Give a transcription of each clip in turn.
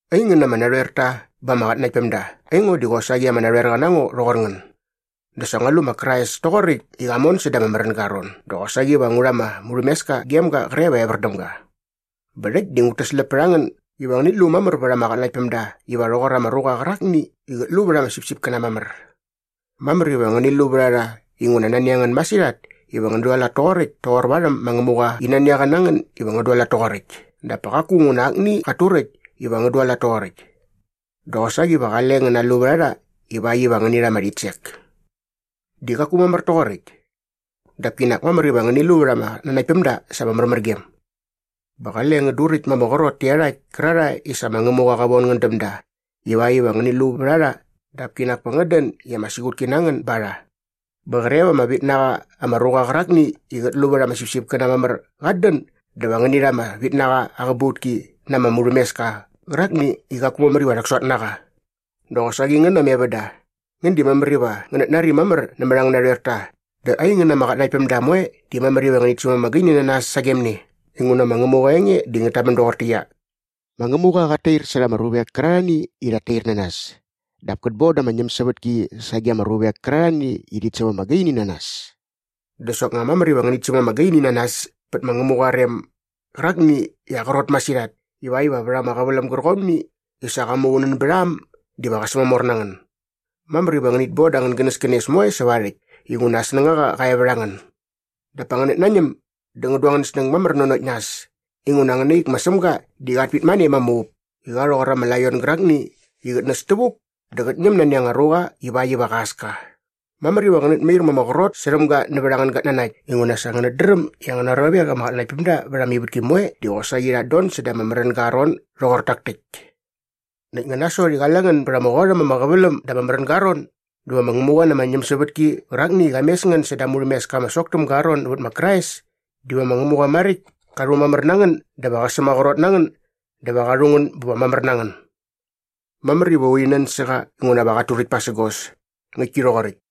Aingän ama narhoerta ba ama qatnanaktpämda, aingo di qosaqi ama narhoerqa na ngo rhoqor ngän. Dä sa ngua lu ma Krais toqoräkt i qa mon säda ama märänga aa ron dä qosaqi va ngu rha ama murhämeska gem ga qre va evär däm ga. Bä rhäkt di ngut täsläp pät a ngän iva ngänit lu mamär vät ama qatnanaktpämda iva rhoqor ama ruqa qärakni i qät lu vät ama sipsipkäna mamär. Mamär iva ngäni lu vät a rha inguna nani a ngän masirhat iva ngän dualat toqoräkt toqor varhäm ma Ngämuqa i nani a qa na ngän iva ngän dualat toqoräkt dap pa qaku nguna akni qat turäkt iva ngän dualat toqoräkt. Dä qosaqi va qale ngän nalu vät a rha ivakt iva ngäni rha ama rhitsek. Di qaku mamär toqoräkt. Dap kinak mamär iva ngäni lu vät ama qatnanaktpämda sa ama märmärgem. Bä qale ngän duräkt ma ama qrot tä iarhakt kärarhae i sa ma Ngämuqa qa von ngän däm da ivakt iva ngänit lu vät a rha dap kinak pa ngän dän i ama siqutki na ngän ba rha. Bä qre va ama vit na qa ama ruqa qärakni i qät lu vät ama sipsipkäna mamär qat dän dä va ngäni rha ama vitnaqa aa qäbautki na ama murhämeska qärakni i qaku mamär iva rhäksot na qa. Dä qosaqi ngän ama evända, ngän di mamär iva ngänät nari mamär nämät angän narhoerta dä aingän ama qatnanaktpämda moe di mamär iva ngänit säm ama gaini na nas sagem ne inguna ma Ngämuqa aa enge di ngät tamän doqortäqyia, “Ma Ngämuqa qat tair särha ama ruvek kärarhani i rhat tair na nas dap kät bon da ama ñämsävätki sage ama ruvek kärarhani i rhit säm ama gaini na nas.” Dä soknga mamär iva ngänit säm ama gaini na nas pät ma Ngämuqa aa rem gärakni i aa qrot masirhat ivakt iva vät ama qäväläm gärqomni i sa qa muqunän bät a äm diva qä sämamor na ngän. Mamär iva ngänit bon da angän gänäskänes moe säva aa rhäkt inguna aa snängaqa qa e vät a ngän. Dap pa ngänät nañäm dä ngän du angän snäng mamär nanokt nas inguna angäna ik ma Sämga di qat pitmane ma ama up i qa rhoqor ama laion gärakni i qät näs tävuk dä qät ñäm nani anga ruqa ivakt iva qa äs ka. Mamär iva ngänät mair ma ama qrot särhäm ga nävät angän gatnanakt inguna sa ngänät dräm i angäna ruavek ama qatnanaktpämda vät ama ivätki moe di qosaqi rhat don säda ama märänga aa ron doqor tak täkt. Näkt nga nasot i qale ngän bät ama qot äm ama qäväläm da ama märänga aa ron dä va ma Ngämuqa na ama ñämsävätki qärakni i qa mes ngän säda aa murhämeska ama sok täm ga nävät ma Krais diva ma Ngämuqa maräkt ka rhumamär na ngän dä va qä sämaqrot na ngän dä va qa rhu ngän bä va mamär na ngän. Mamär iva urhi nän sä qa inguna va qat turäkt pasägos. Ngäktki rhoqoräkt.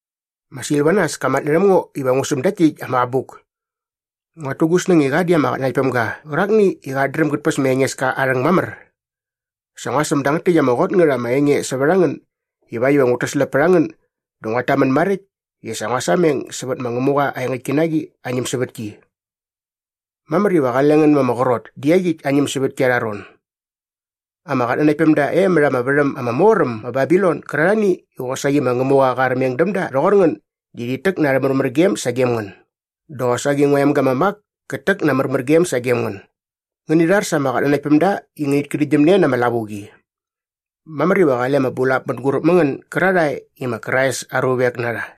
Ma Silvanas ka matnärhäm ngo iva ngu säm dakt täkt ama abuk. Nguat tu gu snäng i qa di ama qatnanaktpämga qärakni i qat dräm gät päs ma Engeska aa rhäng mamär. Sa ngua säm dangät täkt ama qot ngät ama enge sävät a ngän ivakt iva ngut täsläp pät a ngän dä nguat tamän maräkt i sa ngua sameng sävät ma Ngämuqa aa engäktki na qi aa ñämsävätki. Mamär iva qale ngän ma ama qrot dä iaqyäkt aa ñämsävätki arha ron. Ama qatnanaktpämda e mät ama värhäm ama mor äm ma Babilon gärarhani i qosaqi ma Ngämuqa qa armeng däm da rhoqor ngän di rhit täk na arhä märmärgem sagem ngän dä qosaqi ngua emga ma Mak kät täk na aa märmärgem sagem ngän. Ngäni rhar sa ama qatnanaktpämda i ngänit kärhäktgyäm ne na ama lavuqi. Mamär iva qale ama bulap mänguräp mä ngän gärarhae i ma Krais aa ruvek na rha.